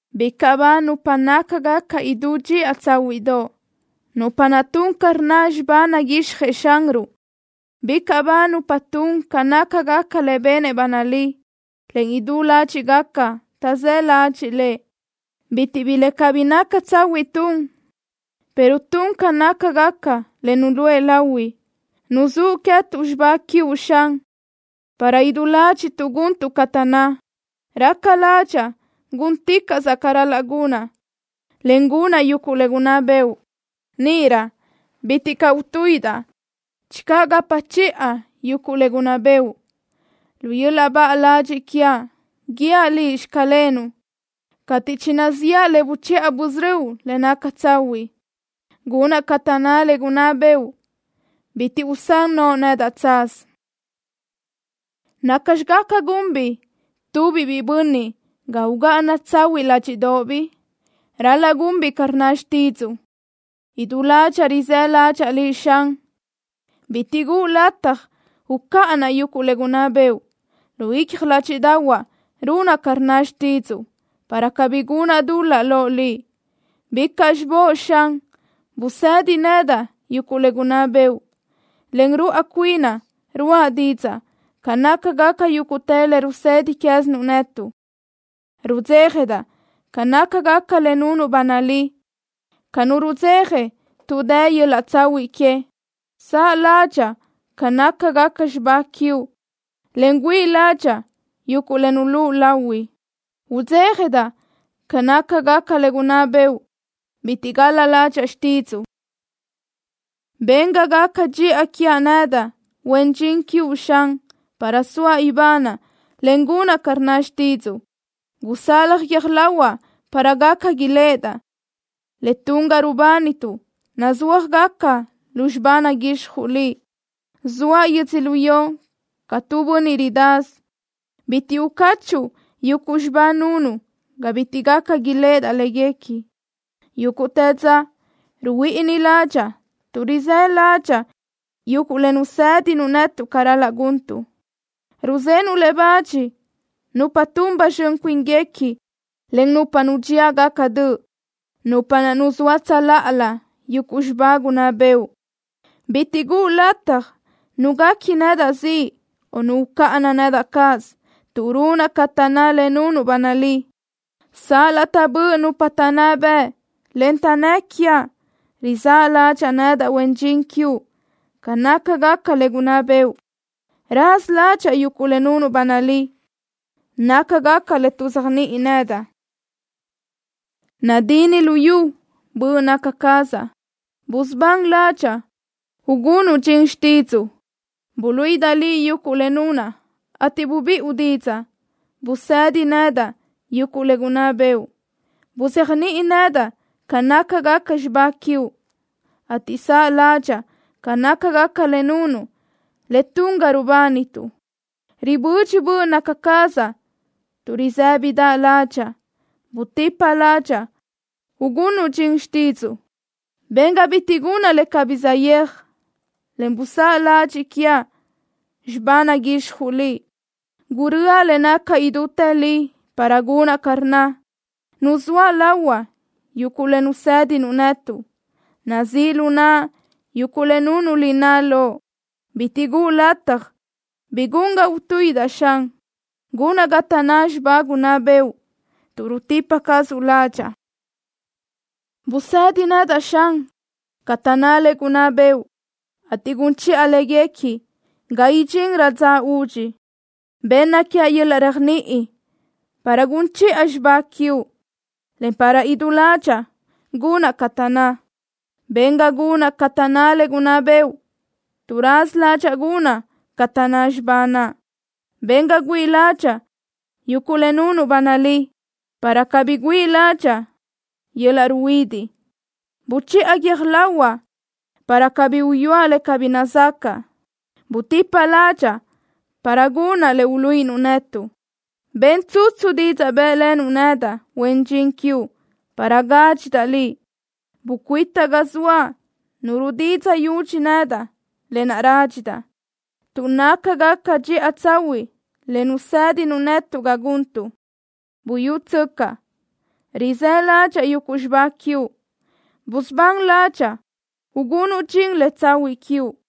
¡Bicaʼ ba nupa nácagaca idú dxiʼa tsáhuiʼdoʼ, nupa naʼ tun ca rnna xibá naguixjëʼ Xanruʼ! ¡Bicaʼ ba nupa tun ca nácagaca le benëʼ ba nalí, en idú ládxiʼgaca taʼzë́ ladxiʼ Lëʼ! Bitiʼ bi le cabí naca tsahuiʼ tun, pero tun ca nácagaca le nuluʼë lahui. Nuzúʼ queë́tuʼ xibá quiuʼ, Xan, para idú ládxiʼtuʼ guntuʼ ca taʼnná. Raca ládxaʼa gúnticaʼsaʼ ca ral-laʼ gunaʼ, en gunaʼ yuguʼ le gunná bëʼu. Níʼirö bitiʼ caʼ utuíʼidaʼ channö gapa chiʼa yuguʼ le gunná bëʼu. Lu yöl-laʼ baʼa ladxiʼ quiaʼ guíaʼ Liʼ: “Xclenuʼ” cateʼ chinaziʼa le buchiʼa busörö́uʼ le naca tsahuiʼ. Gunaʼ ca taʼnná le gunná bëʼu. Bitiʼ usán noʼo nedaʼ tsaz. ¿Nacxi gaca gunbiʼ tu biʼi bönniʼ ga ugáʼana tsahuiʼ ládxiʼdoʼobiʼ? Ral-laʼ gunbiʼ ca rnna xtídzuʼu. Idú ládxaʼa rizë́ ládxaʼa Liʼ, Xan. Bitiʼ guʼu lataj ucáʼanaʼ yuguʼ le gunná bëʼu. Lu icja ládxiʼdaʼahuaʼ runaʼ ca rnna xtídzuʼu, para cabí gunaʼ dul-laʼ loʼ Liʼ. ¡Bicaʼ xibóʼ, Xan! Busedi nedaʼ yuguʼ le gunná bëʼu. Len ruáʼ cuinaʼ ruʼa didzaʼ ca nácagaca yúguʼtë le rusedi quézinuʼ netuʼ. Rudzéjadaʼ ca nácagaca le nunuʼ ba nalí ca nu rudzeja tuʼ dë yöl-laʼ tsahuiʼ que. Saʼ ládxaʼa ca nácagaca xibá quiuʼ en güíʼi ládxaʼa yuguʼ le nulúʼu lahui. Udzéjadaʼ ca nácagaca le gunná bëʼu. Bitiʼ gal-la ládxaʼa xtídzuʼu. Ben ga gaca dxiʼa quiaʼ nedaʼ, huen dxin quiuʼ, Xan, para soaʼ ibanaʼ, en gunaʼ ca rnna xtídzuʼu. Gusalaj guiö́j lahuaʼ para gaca iléʼedaʼ le tun ga rubánituʼ nazúajgaca lu xibá naguixjuʼ Liʼ. Zoaʼ yödzölió ca tu bönniʼ ridasö. Bitiʼ ucachuʼu yuguʼ xibá nunuʼ ga bitiʼ gaca iléʼedaʼ léguequi. Yúguʼtë dza ruhuíʼini ládxaʼa tuʼ rizë́ ládxaʼa yuguʼ le nusédinuʼ netuʼ ca ral-laʼ guntuʼ. Ruzenuʼ le bach nupa tun ba zxön cuínguequi, en nupa nudxíagaca döʼ, nupa naʼ tuʼzóa tsöláʼalö yuguʼ xibá gunná bëʼu. Bitiʼ guʼu lataj nu guequi nedaʼ ziʼ o nu ucáʼana nedaʼ cáʼasö, tuʼ runaʼ ca taʼnná le nunuʼ ba nalí. Sal-laʼ taʼbö́ʼ nupa taʼnná bëʼ, en taʼnnë́ quiaʼ, rizáʼ ládxaʼa nedaʼ, huen dxin quiuʼ, ca nácagaca le gunná bëʼu. Raza ládxaʼa yuguʼ le nunuʼ ba nalí. Nácagaca le tuʼzéajniʼi nedaʼ. Nadinni lu yu böʼ naca cazaʼ. Busubán ládxaʼa, ugunuʼ dxin xtídzuʼu. Buluíʼidaʼ Liʼ yuguʼ le nunaʼ, ateʼ bubiʼu didzaʼ. Busedi nedaʼ yuguʼ le gunná bëʼu. Buzéajniʼi nedaʼ ca nácagaca xibá quiuʼ, ateʼ saʼ ládxaʼa ca nácagaca le nunuʼ, le tun ga rubánituʼ. Ribödxi böʼ naca cazaʼ tuʼ risë́bidaʼ ládxaʼa. Butipa ládxaʼa, ugunuʼ dxin xtídzuʼu. Ben ga bitiʼ gunaʼ le cabí saʼyéaj, en buzáʼ ladxiʼ quiaʼ xibá naguixjuʼ Liʼ. Gurö́aʼ le naca idútë li para gunaʼ ca rnna. Nuzóaʼ lahuaʼ yuguʼ le nusédinuʼ netuʼ. Nazíʼ lu naʼa yuguʼ le nunuʼ lináʼ lo. Bitiʼ guʼu lataj bi gun ga utuíʼidaʼ, Xan. Gunaʼ ca taʼnná xibá gunná bëʼu, tuʼ rutipa cazuʼ ládxaʼa. Busedi nedaʼ, Xan, ca taʼnná le gunná bëʼu, ateʼ gun chiʼa léguequi ga idxinrö dza udxi. Benna quiaʼ yöl-laʼ réajniʼi para gun chiʼa xibá quiuʼ, en para idú ládxaʼa gunaʼ ca taʼnná. Ben ga gunaʼ ca taʼnná le gunná bëʼu, tuʼ raza ládxaʼa gunaʼ ca taʼnná xibá naʼ. Ben ga güíʼi ládxaʼa yuguʼ le nunuʼ ba nalí, para cabí güíʼi ládxaʼa yöl-laʼ ruhuidiʼ. Buchiʼa guiö́j lahuaʼ para cabí uyúaʼ le cabí nazacaʼ. Butipa ládxaʼa para gunaʼ le uluíʼinuʼ netuʼ. Ben tsutsu didzaʼ bë́ʼlenuʼ nedaʼ, huen dxin quiuʼ, para gádxidaʼ Liʼ. Bucuita ga zoaʼ nu rudidzaʼ yudxi nedaʼ, lë naʼ rádxidaʼ tuʼ nácagaca dxiʼa tsahuiʼ le nusédinuʼ netuʼ ca guntuʼ. Buyútsöcaʼ, rizë́ ládxaʼa yuguʼ xibá quiuʼ. Busubán ládxaʼa, ugunuʼ dxin le tsahuiʼ quiuʼ.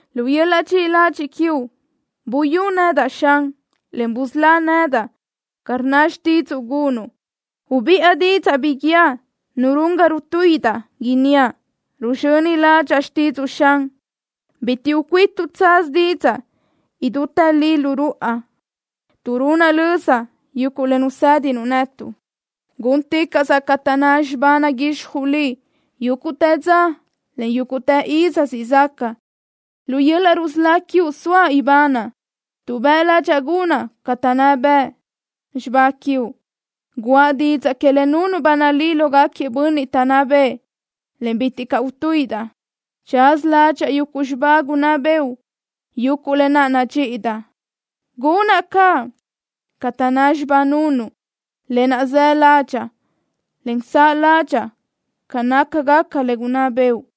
Lu yöl-laʼ dxiʼi ladxiʼ quiuʼ buyú nedaʼ, Xan, en busölá nedaʼ ca rnna xtídzuʼu gunuʼ. Ubiʼa didzaʼ bi guíaʼ nu run ga rutuíʼidaʼ, inníaʼ: “Ruzxöni ládxaʼa xtídzuʼu”, Xan. Bitiʼ ucuítuʼ tsaz didzaʼ idútë li lu ruʼa tuʼ runaʼ löza yuguʼ le nusédinuʼ netuʼ. Gúnticaʼsaʼ ca taʼnná xibá naguixjuʼ Liʼ yúguʼtë dza, en yúguʼtë iz siʼ zaca. Lu yöl-laʼ rusölá quiuʼ soaʼ ibanaʼ tuʼ bëʼ ládxaʼa gunaʼ ca taʼnná bëʼ xibá quiuʼ. Guʼa didzaʼ que le nunuʼ ba nalí lógaquiëʼ bönniʼ taʼnná bëʼë en bitiʼ caʼ utuíʼidaʼ. Tsaza ládxaʼa yuguʼ xibá gunná bëʼu, yuguʼ lë naʼ nadxíʼidaʼ. Gunaʼ caʼ ca taʼnná xibá nunuʼ, lë naʼ së ládxaʼa, en saʼ ládxaʼa ca nácagaca le gunná bëʼu.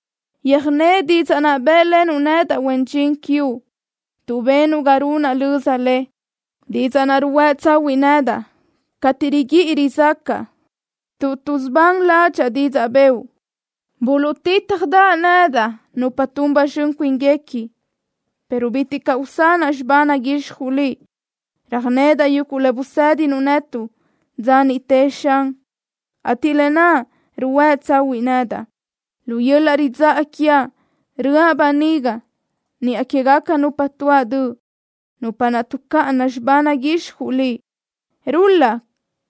Yöjné didzaʼ naʼ bë́ʼlenuʼ nedaʼ, huen dxin quiuʼ, tuʼ benuʼ ga runaʼ löza le. Didzaʼ naʼ ruhuë́ tsahuiʼ nedaʼ cateʼ riguíʼi rizácaʼa, tuʼ tuʼsubán ládxaʼa didzaʼ bëʼu. Tuʼtítjalëʼe nedaʼ nupa tun ba zxön cuínguequi, pero bitiʼ caʼ usanaʼ xibá naguixjuʼ Liʼ. Röjnedaʼ yuguʼ le busédinuʼ netuʼ dza niʼte, Xan, ateʼ lë naʼ ruhuë́ tsahuiʼ nedaʼ. Lu yöl-laʼ ridzáʼa quiaʼ röʼa böniga niʼa quégaca nupa tuáʼ döʼ, nupa naʼ tuʼcáʼana xibá naguixjuʼ Liʼ. Rul-laʼ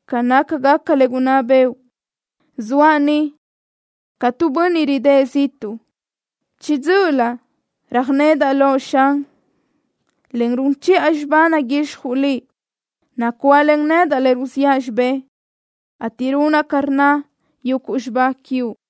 ca nácagaca le gunná bëʼu. Zoaʼ ni ca tu bönniʼ ridë́ʼ ziʼtuʼ. Chiʼi dzö́ʼölö röjnedaʼ Loʼ, Xan, en run chiʼa xibá naguixjuʼ Liʼ. Nacuáʼlen nedaʼ le ruziʼa xibé ateʼ runaʼ ca rnna yuguʼ xibá quiuʼ.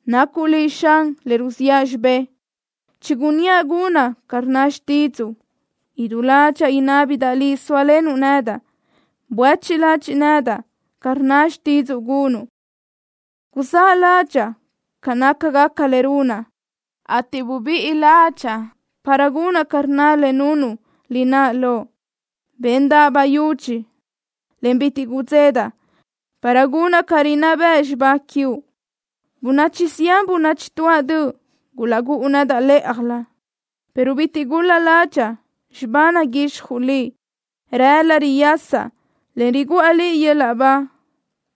Nacuʼ Liʼ, Xan, le ruziʼa xibé. Chigunníaʼ gunaʼ ca rnna xtídzuʼu. Idú ládxaʼa inábidaʼ Liʼ sóalenuʼ nedaʼ. Buéchiʼ ladxiʼ nedaʼ ca rnna xtídzuʼu gunuʼ. Guzáʼ ládxaʼa ca nácagaca le runaʼ, ateʼ bubíʼi ládxaʼa para gunaʼ ca rnna le nunuʼ lináʼ lo. Béndaʼa bayúdx, en bitiʼ gudzedaʼ para gunaʼ ca rinná bëʼ xibá quiuʼ. Bönachi zián bönachi tuáʼ döʼ gulaʼgúʼu nedaʼ lë́ʼajlö, pero bitiʼ gul-la ládxaʼa xibá naguixjuʼ Liʼ. Gulahuë́la riyasaʼ, en riguʼa Liʼ yöl-laʼ ba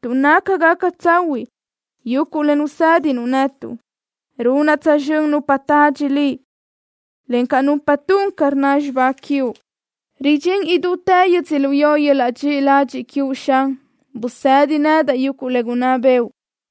tuʼ nácagaca tsahuiʼ yuguʼ le nusédinuʼ netuʼ. Runaʼ tsözxö́n nupa tadxi Liʼ, encaʼ nupa tun ca rnna xibá quiuʼ. Ridxín idútë yödzölió yöl-laʼ dxiʼi ladxiʼ quiuʼ, Xan. Busedi nedaʼ yuguʼ le gunná bëʼu.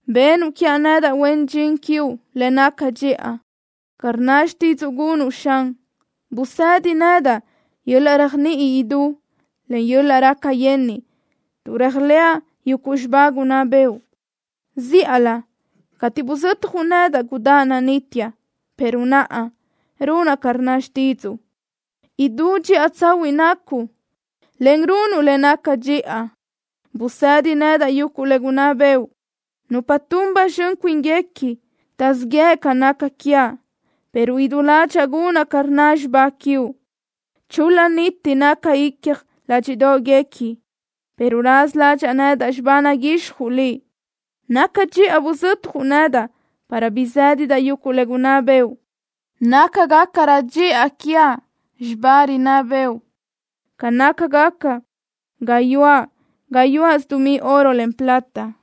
Benuʼ quiaʼ nedaʼ, huen dxin quiuʼ, le naca dxiʼa, ca rnna xtídzuʼu gunuʼ, Xan. Busedi nedaʼ yöl-laʼ réajniʼi idú, en yöl-laʼ raca yenniʼ, tuʼ réajlëʼa yuguʼ xibá gunná bëʼu. Zíʼalö cateʼ buzötjuʼ nedaʼ gudáʼ nanitiaʼ, pero naʼa runaʼ ca rnna xtídzuʼu. Idú dxiʼa tsahuiʼ nacuʼ, en runuʼ le naca dxiʼa. Busedi nedaʼ yuguʼ le gunná bëʼu. Nupa tun ba zxön cuínguequi taʼzíʼ yëʼ ca naca quiaʼ, pero idú ládxaʼa gunaʼ ca rnna xibá quiuʼ. Chul-la niti naca icja ládxiʼdoʼguequi, pero raza ládxaʼa nedaʼ xibá naguixjuʼ Liʼ. Naca dxiʼa buzötjuʼ nedaʼ para bizédidaʼ yuguʼ le gunná bëʼu. Nácagacarö dxiʼa quiaʼ xibá rinná bëʼu ca nácagaca gayuáʼ gayuáʼsö dumí oro, en plata.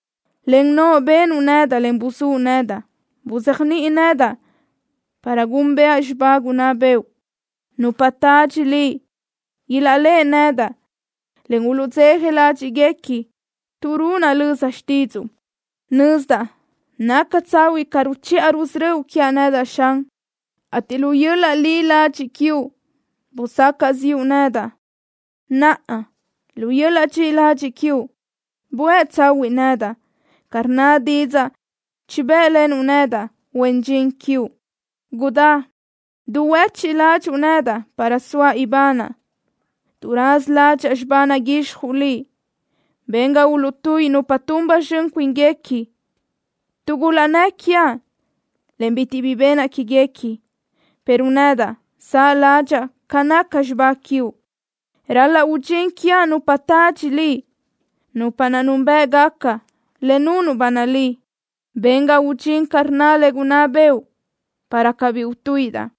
Len noʼo benuʼ nedaʼ, en buzúʼ nedaʼ. Buzéajniʼi nedaʼ para gúnbëʼa xibá gunná bëʼu. Nupa tadxi Liʼ ilaʼléʼe nedaʼ, en uluʼdzeja ládxiʼguequi, tuʼ runaʼ löza xtídzuʼu. Nözdaʼ naca tsahuiʼ ca ruchiʼa rusörö́uʼ quiaʼ nedaʼ, Xan, ateʼ lu yöl-laʼ li ladxiʼ quiuʼ busacaʼ ziʼu nedaʼ. Naʼa, lu yöl-laʼ dxiʼi ladxiʼ quiuʼ buë tsahuiʼ nedaʼ, ca rnna didzaʼ chibë́ʼlenuʼ nedaʼ, huen dxin quiuʼ. Gudá duhuechiʼ ládxuʼu nedaʼ para soaʼ ibanaʼ, tuʼ raza ládxaʼa xibá naguixjuʼ Liʼ. Ben ga uluʼtuíʼi nupa tun ba zxön cuínguequi, tuʼ gulaʼnnë́ quiaʼ, en bitiʼ bi benaʼ quéguequi, pero nedaʼ saʼ ládxaʼa ca naca xibá quiuʼ. Ral-laʼ udxín quiaʼ nupa tadxi Liʼ, nupa naʼ núnbëʼgaca le nunuʼ ba nalí. Ben ga udxín ca rnna le gunná bëʼu, para cabí utuíʼidaʼ.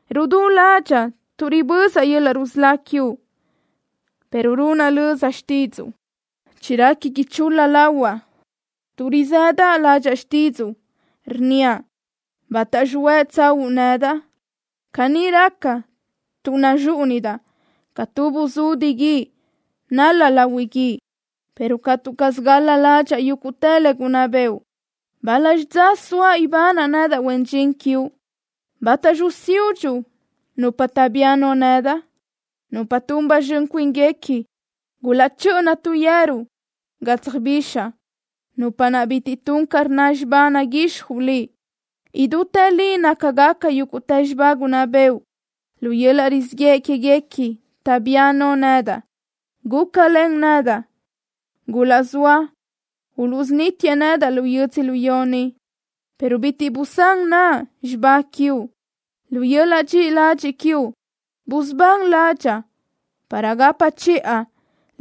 Rudú ládxaʼa tuʼ ribözaʼ yöl-laʼ rusölá quiuʼ, pero runaʼ löza xtídzuʼu. Chirequi ichul-la lahuaʼ tuʼ rizëdaʼ ládxaʼa xtídzuʼu, rnníaʼ: “¿Bátaxi huë tsaúʼu nedaʼ?” Caní raca tuʼ naxúʼunidaʼ ca tu buzudi guídi nal-laʼ lahui guíʼ, pero catu caz gal-la ládxaʼa yuguʼ le gunná bëʼu. ¿Bál-laxi dza soaʼ ibanaʼ nedaʼ, huen dxin quiuʼ? ¿Bátaxi usiúdxuʼ nupa taʼbía no nedaʼ? Nupa tun ba zxön cuínguequi gulaʼchö́ʼöna tu yeru ga tsöjbixaʼ, nupa naʼ bitiʼ tun ca rnna xibá naguixjuʼ Liʼ. Idútë li nácagaca yúguʼtë xibá gunná bëʼu. Lu yöl-laʼ rizíʼ yëʼ quéguequi taʼbía no nedaʼ. ¡Gúcalen nedaʼ! Gulaʼzóa uluʼsunítiëʼ nedaʼ lu yödzölió ni, pero bitiʼ busán naʼa xibá quiuʼ. Lu yöl-laʼ dxiʼi ladxiʼ quiuʼ busubán ládxaʼa, para gapa chiʼa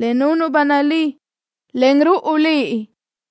le nunuʼ ba nalí len ruáʼ cuinuʼ.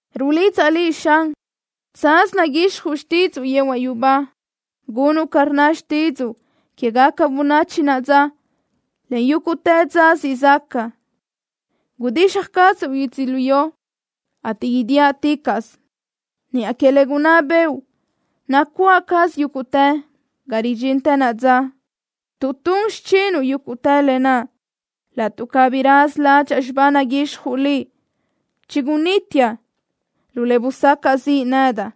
Rulidzaʼ Liʼ, Xan. Tsaz naguixjuʼ xtídzuʼu yehuaʼ yubá. Gunuʼ ca rnna xtídzuʼu quégaca bönachi naʼa dza, en yúguʼtë dza siʼ zaca. Gudixaj cazuʼ yödzölió, ateʼ idíaʼticaʼsö. Niʼa que le gunná bëʼu nacuáʼ caz yúguʼtë ga ridxintë naʼa dza, tuʼ tun xichinuʼ yúguʼtë lë naʼ. Laʼtuʼ cabí raza ládxaʼa xibá naguixjuʼ Liʼ, chigunítiaʼ lu le busacaʼ ziʼ nedaʼ.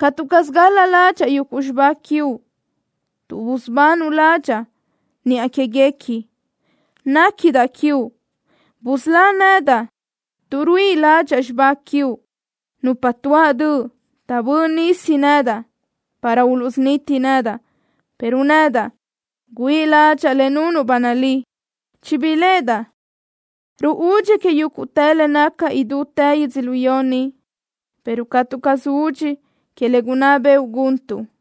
Catu caz gal-la ládxaʼa yuguʼ xibá quiuʼ, tuʼ busubanuʼ ládxaʼa niʼa quéguequi. Néquidaʼ quiuʼ. ¡Busölá nedaʼ, tuʼ ruíʼi ládxaʼa xibá quiuʼ! Nupa tuáʼ döʼ taʼbö́ʼ nisi nedaʼ para uluʼsuniti nedaʼ, pero nedaʼ güíʼi ládxaʼa le nunuʼ ba nalí. Chibiléʼedaʼ ruúdxi que yúguʼtë le naca idútë yödzölió ni, pero catu caz udxi que le gunná bëʼu guntuʼ.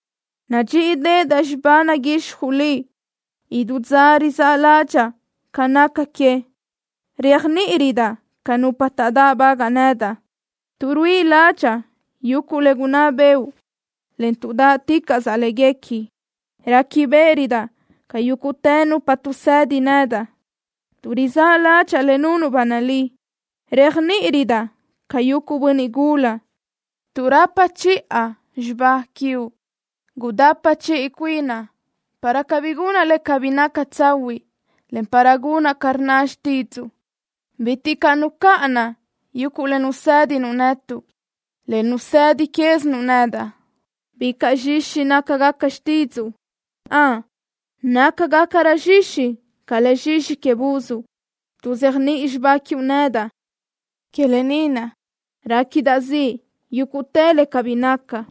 Nadxíʼideʼedaʼ xibá naguixjuʼ Liʼ. Idú dza rizáʼ ládxaʼa ca naca que. Réajniʼirödaʼ ca nupa taʼdáʼbagaʼ nedaʼ tuʼ ruíʼi ládxaʼa yuguʼ le gunná bëʼu, en tuʼ dáʼticaʼsaʼ léguequi. Réquibeʼerödaʼ ca yúguʼtë nupa tuʼsedi nedaʼ, tuʼ rizáʼ ládxaʼa le nunuʼ ba nalí. Réajniʼirödaʼ ca yuguʼ bönniʼ gula, tuʼ rapa chiʼa xibá quiuʼ. Gudapa chiʼi cuinaʼ para cabí gunaʼ le cabí naca tsahuiʼ, en para gunaʼ ca rnna xtídzuʼu. Bitiʼ caʼ nucáʼanaʼ yuguʼ le nusédinuʼ netuʼ, le nusedi quézinuʼ nedaʼ. Bicaʼ zxixi nácagaca xtídzuʼu. Ön, nácagacarö zxixi ca le zxixi que buz. Tuʼzéajniʼi xibá quiuʼ nedaʼ. Que lë ni naʼ réquidaʼ ziʼ yúguʼtë le cabí naca.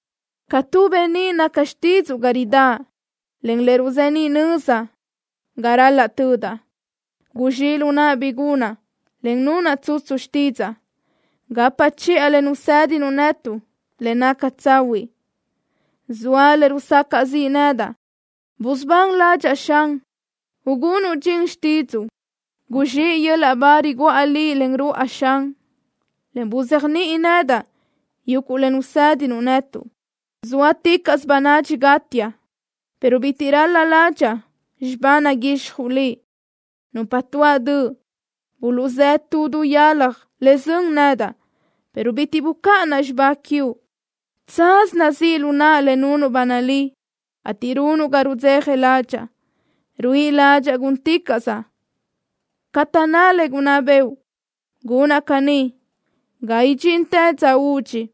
Ca tu beníʼ naca xtídzuʼu ga ridáʼ, en le ruzeníʼ nöza ga ral-laʼ tödaʼ. Guzxíʼ lu naʼa bi gunaʼ, en nunaʼ tsutsu xtídzaʼa. Gapa chiʼa le nusédinuʼ netuʼ le naca tsahuiʼ. Zoa le rusacaʼ ziʼ nedaʼ. Busubán ládxaʼa, Xan, ugunuʼ dxin xtídzuʼu. Guzxíʼ yöl-laʼ ba riguʼa Liʼ len ruʼa, Xan, en buzéajniʼi nedaʼ yuguʼ le nusédinuʼ netuʼ. Zóaticaʼsö bönadxi gátiaʼ, pero bitiʼ ral-la ládxaʼa xibá naguixjuʼ Liʼ. Nupa tuáʼ döʼ buluʼzë́ tu du yalaj le sön nedaʼ, pero bitiʼ bucáʼanaʼ xibá quiuʼ. Tsaz nazíʼ lu naʼa le nunuʼ ba nalí, ateʼ run ga rudzeja ládxaʼa. Ruíʼi ládxaʼa gúnticaʼsaʼ ca taʼnná le gunná bëʼu. Gunaʼ caní ga idxintë dza udxi.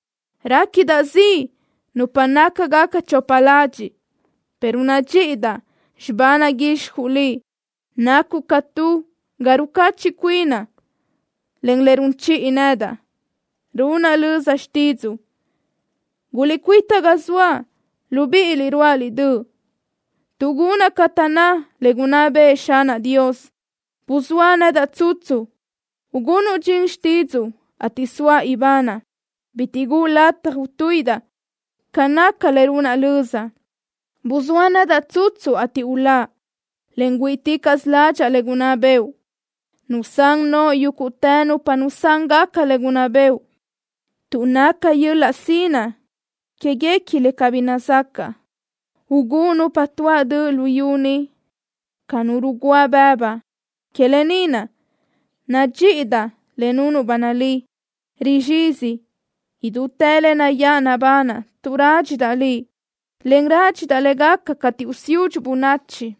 Réquidaʼ ziʼ nupa nácagaca chopa ladxiʼ, pero nadxíʼidaʼ xibá naguixjuʼ Liʼ. Nacuʼ ca tu ga rucachiʼ cuinaʼ, en le run chiʼi nedaʼ. Runaʼ löza xtídzuʼu. Guliʼcuíta ga zoaʼ, libíʼiliʼ ruáʼaliʼ döʼ, tuʼ gunaʼ ca taʼnná le gunná bëʼë Xanaʼ Dios. Buzóa nedaʼ tsutsu, ugunuʼ dxin xtídzuʼu, ateʼ soaʼ ibanaʼ. Bitiʼ guʼu lataj utuíʼidaʼ ca naca le runaʼ löza. Buzóa nedaʼ tsutsu, ateʼ uláʼ, en güíʼiticaʼsaʼ ládxaʼa le gunná bëʼu. Nusán noʼo yúguʼtë nupa nusángaca le gunná bëʼu, tuʼ naca yöl-laʼ sinaʼ quéguequi le cabí nazacaʼ. Ugúʼ nupa tuáʼ döʼ luyú ni ca nu rugúa bëbu. Que lë ni naʼ nadxíʼidaʼ le nunuʼ ba nalí. Rizxizi idútë le nayáʼ nabanaʼ tuʼ rádxidaʼ Liʼ, en rádxidaʼ le gaca cateʼ usiúdxuʼ bönachi.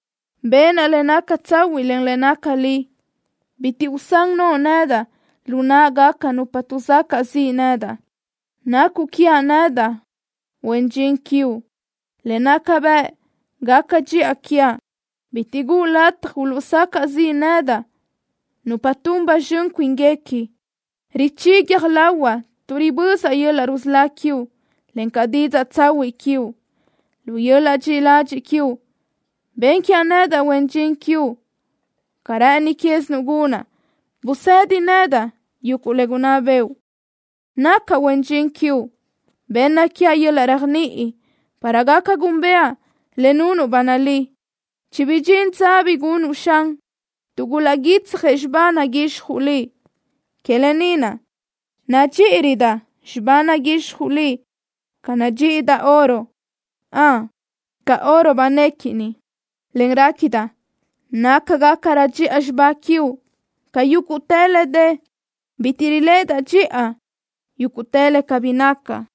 Benaʼ le naca tsahuiʼ, en le naca li. Bitiʼ usán noʼo nedaʼ lu náʼagaca nupa tuʼsacaʼ ziʼ nedaʼ. Nacuʼ quiaʼ nedaʼ, huen dxin quiuʼ, le naca bëʼ gaca dxiʼa quiaʼ. Bitiʼ guʼu lataj uluʼsacaʼ ziʼ nedaʼ nupa tun ba zxön cuínguequi. Richí guiö́j lahuaʼ tuʼ ribözaʼ yöl-laʼ rusölá quiuʼ, encaʼ didzaʼ tsahuiʼ quiuʼ. Lu yöl-laʼ dxiʼi ladxiʼ quiuʼ ben quiaʼ nedaʼ, huen dxin quiuʼ, ca rë́ʼëni quézinuʼ gunuʼ. Busedi nedaʼ yuguʼ le gunná bëʼu. Nacaʼ huen dxin quiuʼ. Benna quiaʼ yöl-laʼ réajniʼi para gaca gúnbëʼa le nunuʼ ba nalí. Chibidxín dza bi gunuʼ, Xan, tuʼ gulaʼguítsjëʼ xibá naguixjuʼ Liʼ. Que lë ni naʼ nadxíʼirödaʼ xibá naguixjuʼ Liʼ ca nadxíʼidaʼ oro. ¡Ön, ca oro banéquini, en réquidaʼ nácagacarö dxiʼa xibá quiuʼ ca yúguʼtë le dë! Bitiʼ riléʼedaʼ dxiʼa yúguʼtë le cabí naca.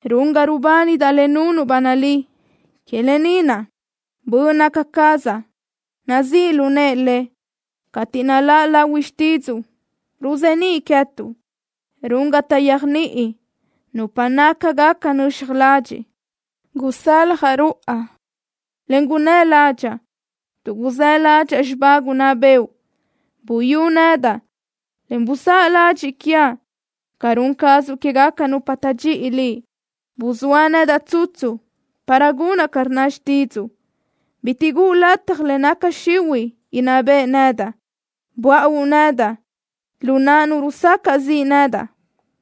Run ga rubánidaʼ le nunuʼ ba nalí. Que lë ni naʼ böʼ naca cazaʼ nazíʼ lu nëʼe le. Cateʼ naláʼ lahui xtídzuʼu, ruzeníʼ queë́tuʼ. Run ga taʼyéajniʼi nupa nácagaca nöxaj ladxiʼ. Gusaljaʼ ruʼa, en gunnë́ ládxaʼa, tuʼ guzë́ ládxaʼa xibá gunná bëʼu. Buyú nedaʼ, en buzáʼ ladxiʼ quiaʼ, ca run cazuʼ quégaca nupa taʼdxíʼi Liʼ. Buzóa nedaʼ tsutsu para gunaʼ ca rnna xtídzuʼu. Bitiʼ guʼu lataj le naca xihuiʼ inná beʼe nedaʼ. Buáʼu nedaʼ lu naʼ nu rusacaʼ ziʼ nedaʼ,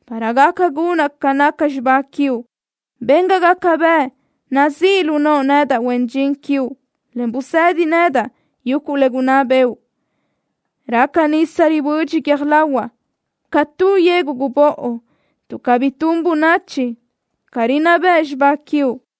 para gaca gunaʼ ca naca xibá quiuʼ. Ben ga gaca bëʼ nazíʼ lu noʼo nedaʼ, huen dxin quiuʼ, en busedi nedaʼ yuguʼ le gunná bëʼu. Raca nisa ribödxi guiö́j lahuaʼ ca tu yegu gubóʼo, tuʼ cabí tun bönachi ca rinná bëʼ xibá quiuʼ.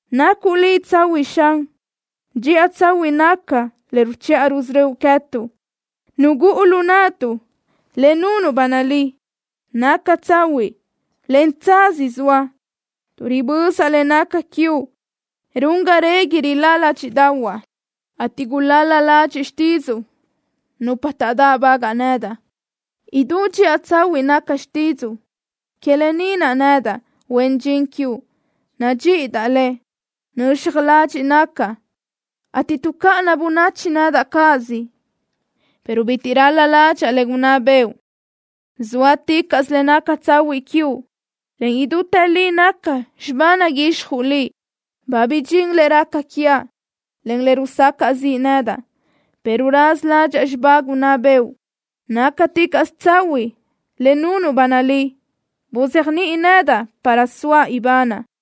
Nacuʼ Liʼ tsahuiʼ, Xan. Dxiʼa tsahuiʼ naca le ruchiʼa rusörö́uʼ quee̲tuʼ. Nugúʼu lu naʼtuʼ le nunuʼ ba nalí. Naca tsahuiʼ, en tsaz zoa. Tuʼ ribözaʼ le naca quiuʼ run ga régui rilá ládxiʼdaʼahuaʼ, ateʼ gulal-la ladxiʼ xtídzuʼu nupa taʼdáʼbagaʼ nedaʼ. Idú dxiʼa tsahuiʼ naca xtídzuʼu. Que lë ni naʼ nedaʼ, huen dxin quiuʼ, nadxíʼidaʼ le. Nöxaj ladxiʼ nacaʼ, ateʼ tuʼcáʼana bönachi nedaʼ cáʼasö, pero bitiʼ ral-la ládxaʼa le gunná bëʼu. Zóaticaʼsö le naca tsahuiʼ quiuʼ, en idútë li naca xibá naguixjuʼ Liʼ. Ba bidxín le raca quiaʼ, en le rusacaʼ ziʼ nedaʼ, pero raza ládxaʼa xibá gunná bëʼu. Nácaticaʼsö tsahuiʼ le nunuʼ ba nalí. Buzéajniʼi nedaʼ para soaʼ ibanaʼ.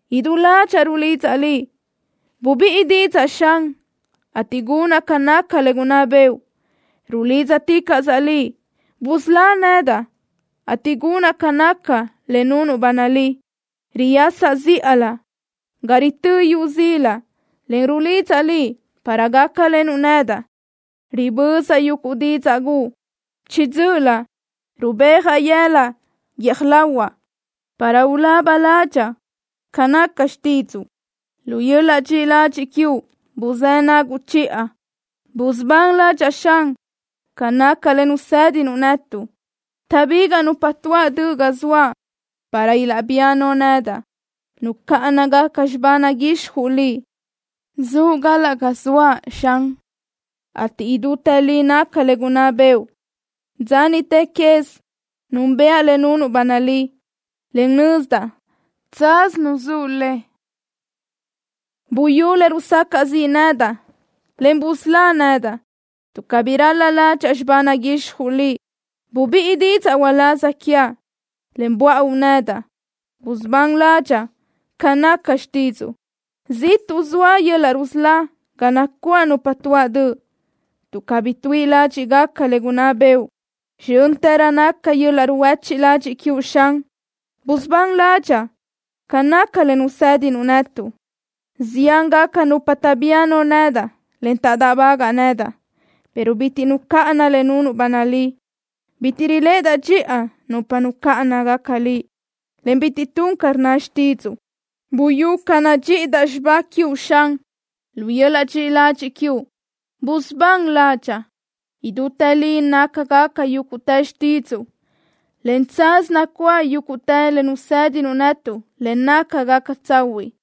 Idú ládxaʼa rulidzaʼ Liʼ. Bubíʼi didzaʼ, Xan, ateʼ gunaʼ ca naca le gunná bëʼu. Rulídzaticaʼsaʼ Liʼ. Busölá nedaʼ, ateʼ gunaʼ ca naca le nunuʼ ba nalí. Riyasaʼ zíʼalö ca ritö́ yu zila, en rulidzaʼ Liʼ para gácalenuʼ nedaʼ. Ribözaʼ yuguʼ didzaʼ guʼu. Chiʼi dzö́ʼölö rubéajaʼ yëla guiö́j lahuaʼ, para ulaba ládxaʼa ca naca xtídzuʼu. Lu yöl-laʼ dxiʼi ladxiʼ quiuʼ buzë́ naguʼ chiʼa. Busubán ládxaʼa, Xan, ca naca le nusédinuʼ netuʼ. Taʼbigaʼ nupa tuáʼ döʼ ga zoaʼ para ilaʼbía no nedaʼ. Nucáʼanagaca xibá naguixjuʼ Liʼ. Zuʼ galaʼ ga zoaʼ, Xan, ateʼ idútë li naca le gunná bëʼu. Dza niʼte quez núnbëʼa le nunuʼ ba nalí, en nözdaʼ tsaz nuzúʼ le. Buyú le rusacaʼ ziʼ nedaʼ, en busölá nedaʼ, tuʼ cabí ral-la ládxaʼa xibá naguixjuʼ Liʼ. Bubíʼi didzaʼ uláz quiaʼ, en buáʼu nedaʼ. Busubán ládxaʼa ca naca xtídzuʼu. Ziʼtuʼ zoa yöl-laʼ rusölá ga nacuáʼ nupa tuáʼ döʼ, tuʼ cabí tuíʼi ládxiʼgaca le gunná bëʼu. Zxö́ntërö naca yöl-laʼ ruhuéchiʼ ladxiʼ quiuʼ, Xan. Busubán ládxaʼa ca naca le nusédinuʼ netuʼ. Ziángaca nupa taʼbía no nedaʼ, en taʼdáʼbagaʼ nedaʼ, pero bitiʼ nucáʼanaʼ le nunuʼ ba nalí. Bitiʼ riléʼedaʼ dxiʼa nupa nucáʼanagaca Liʼ, en bitiʼ tun ca rnna xtídzuʼu. Buyú ca nadxíʼidaʼ xibá quiuʼ, Xan. Lu yöl-laʼ dxiʼi ladxiʼ quiuʼ busubán ládxaʼa. Idútë li nácagaca yúguʼtë xtídzuʼu, en tsaz nacuáʼ yúguʼtë le nusédinuʼ netuʼ le nácagaca tsahuiʼ.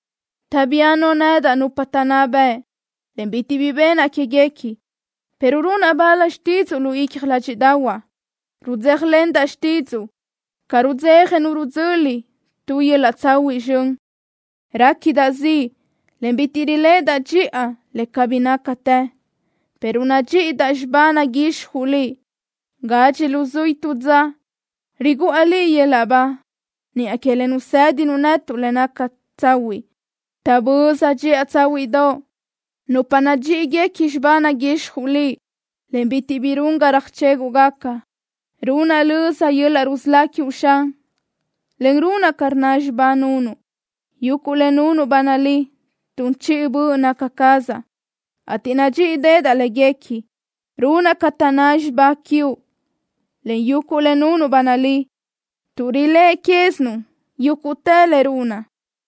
Taʼbía no nedaʼ nupa taʼnná bëʼ, en bitiʼ bi benaʼ quéguequi, pero runaʼ bal xtídzuʼu lu icja ládxiʼdaʼahuaʼ. Rudzéjalendaʼ xtídzuʼu, ca rudzeja nu rudzöli tu yöl-laʼ tsahuiʼ zxön. Réquidaʼ ziʼ, en bitiʼ riléʼedaʼ dxiʼa le cabí nácatë, pero nadxíʼidaʼ xibá naguixjuʼ Liʼ. Gadxi luzuí tu dza riguʼa Liʼ yöl-laʼ ba, niʼa que le nusédinuʼ netuʼ, le naca tsahuiʼ. Taʼböza dxiʼa tsáhuiʼdoʼ nupa nadxíʼigaca xibá naguixjuʼ Liʼ, en bitiʼ bi run ga röjchéguʼgaca. Runaʼ löza yöl-laʼ rusölá quiuʼ, Xan, en runaʼ ca rnna xibá nunuʼ. Yuguʼ le nunuʼ ba nalí tun chiʼi böʼ naca cazaʼ, ateʼ nadxíʼideʼedaʼ léguequi. Runaʼ ca taʼnná xibá quiuʼ, en yuguʼ le nunuʼ ba nalí tuʼ riléʼe quézinuʼ yúguʼtë le runaʼ.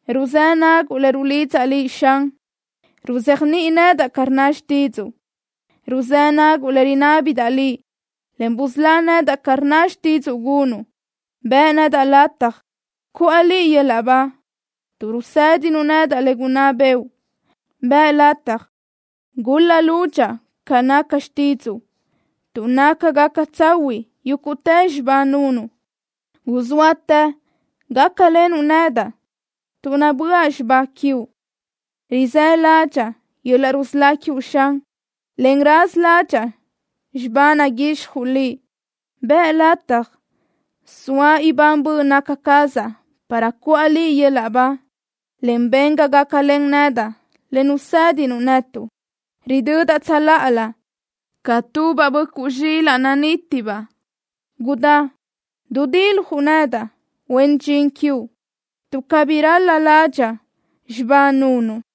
Ruzë́ naguʼ le rulidzaʼ Liʼ, Xan. Ruzéajniʼi nedaʼ ca rnna xtídzuʼu. Ruzë́ naguʼ le rinábidaʼ Liʼ, en busölá nedaʼ ca rnna xtídzuʼu gunuʼ. Bëʼ nedaʼ lataj cuʼa Liʼ yöl-laʼ ba, tuʼ rusédinuʼ nedaʼ le gunná bëʼu. Bëʼ lataj gul-la lúdxaʼa ca naca xtídzuʼu, tuʼ nácagaca tsahuiʼ yúguʼtë xibá nunuʼ. Guzóatë gácalenuʼ nedaʼ, tuʼ nabö́aʼ xibá quiuʼ. Rizë́ ládxaʼa yöl-laʼ rusölá quiuʼ, Xan, en raza ládxaʼa xibá naguixjuʼ Liʼ. Bëʼ lataj soa ibán böʼ naca cazaʼ para cuʼa Liʼ yöl-laʼ ba, en ben ga gácalen nedaʼ le nusédinuʼ netuʼ. Ridödaʼ tsöláʼalö ca tubaʼ böʼcuʼ zxilaʼ nanítibaʼ. Gudá dudiljuʼ nedaʼ, huen dxin quiuʼ, tuʼ cabí ral-la ládxaʼa xibá nunuʼ.